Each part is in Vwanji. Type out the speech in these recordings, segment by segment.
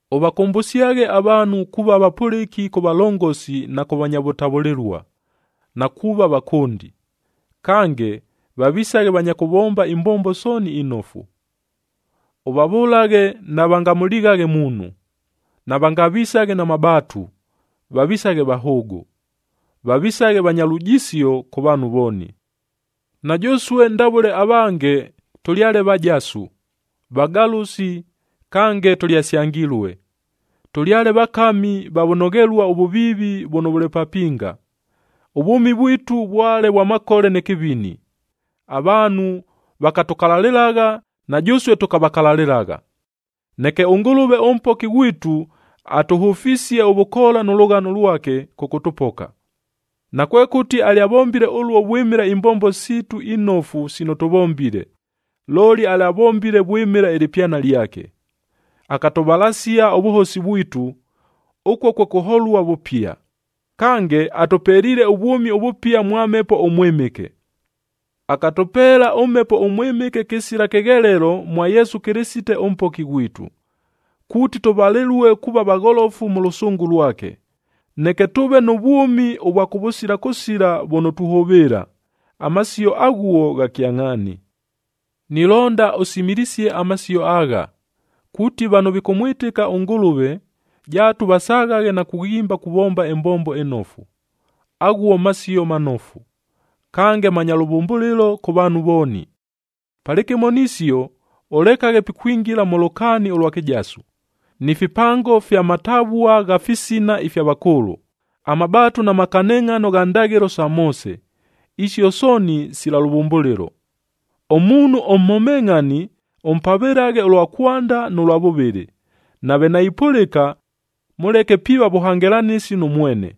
Ʉvakʉmbʉsyaghe avaanhu kuuva vapʉlɨki kʉ valongosi na kʉ vanya vʉtavʉlɨlua, na kuuva vakʉndi. Kange, vavisaghe vanya kʉvomba imbombo sooni inofu. Ʉvavʉlaghe navangamʉlighaghe muunhu, navangavisaghe na mabaatu, vavisaghe vahʉʉgʉ. Vavisaghe vanya lujisio kʉ vaanhu vooni. Na jʉsue ndavʉle avange, tʉlyale vajasu, vagalʉsi, kange tʉlyasyangilue. Tʉlyale vakami va vʉnoghelua ʉvʉviivi vʉno vʉlɨ papinga. Ʉvwʉmi vwitu vwale vwa makole nɨ kɨvini, avaanhu vakatʉkalalɨlagha, na jʉsue tʉkavakalalɨlagha. “Neke ʉNgʉlʉve ʉMpoki ghwitu atʉhʉfisie ʉvʉkoola nʉ lʉghano lwake, kʉkʉtʉpoka. Nakwekʉti alyavombile ʉluo vwɨmɨla imbombo siitu inofu sino tʉvombile, looli alyavombile vwɨmɨla ɨlɨpyana lyake. Akatʉvalasia ʉvʉhosi vwitu, ʉkuo kwe kʉholua vʉpia, kange atʉpeliile ʉvwʉmi ʉvʉpia mwa Mhepo ʉMwɨmɨke. Akatʉpeela ʉMhepo ʉMwɨmɨke kɨsila kɨghelelo mwa Yesu Kɨlɨsite ʉMpoki ghwitu, kuuti tʉvalɨlue kuuva vagholofu mʉ lʉsʉngʉ lwake, neke tʉʉve nʉ vwʉmi ʉvwa kʉvʉsila kʉsila vʉno tuhʉvɨɨla.” Amasio aghuo gha kyangʼhaani. Nilonda ʉsimilisie amasio agha, kuuti vano vikʉmwɨtɨka ʉNgʉlʉve, jaatu vasaghaghe na kughimba kuvomba ɨmbombo ɨnofu. Aghuo masio manofu, kange manya lʉvʉmbʉlɨlo kʉ vaanhu vooni. Palɨkɨmo nisio, ʉlekaghe pikwingila mʉ lʉkaani ʉlwa kɨjasu, ni fipango fya matavua gha fisina ifya vakʉʉlʉ, amabaatu na makanɨngʼhano gha ndaghɨlo sa Moose. Isio sooni sila lʉvʉmbʉlɨlo. Ʉmuunhu ʉmhomengʼhani, ʉmpavɨlaghe ʉlwa kwanda nʉ lwa vʉvɨlɨ, nave naipʉlɨka, mʉleke piiva vʉhangɨlanɨsi nʉ mwene.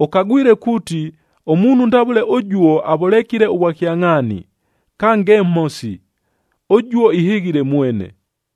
Ʉkagwile kuuti, ʉmuunhu ndavʉle ʉjuo avʉlekile ʉvwakyangʼhaani, kange mhosi, ʉjuo ihɨghile mwene.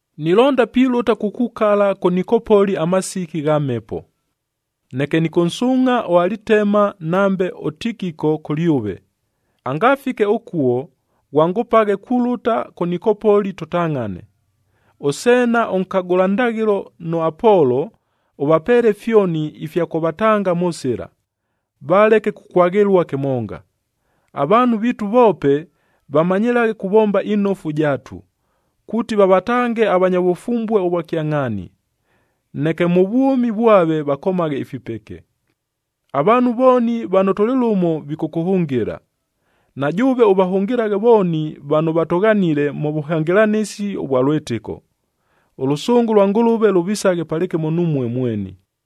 Nilonda pilʉta kukukala kʉ Nikopoli amasiki gha mhepo. Neke nɨkʉnsuungʼha ʉAlitema nambe ʉTikiko kʉlyʉve. Angafike ʉkuo, ghwangʉpaghe kulʉta kʉ Nikopoli tʉtangʼhane. ɄSeena ʉnkagʉla ndaghɨlo nʉ Apolo, ʉvapeele fyoni ifya kʉvatanga mʉ sɨla, valeke kukwaghɨlua kɨmonga. Avaanhu viitu voope, vamanyɨlaghe kuvomba inofu jaatu, kuuti vavatange avanya vʉfumbue ʉvwa kyangʼhaani, neke mʉ vwʉmi vwave vakomaghe ifipeke. Avaanhu vooni vano tʉlɨ lʉmo, vikʉkʉhʉngɨla. Na jʉʉve ʉvahʉngɨlaghe vooni vano vatʉghanile mʉ vʉhangɨlanɨsi vwa lwɨtɨko. Ʉlʉsʉngʉ lwa Ngʉlʉve lʉvisaghe palɨkɨmo numue mweni.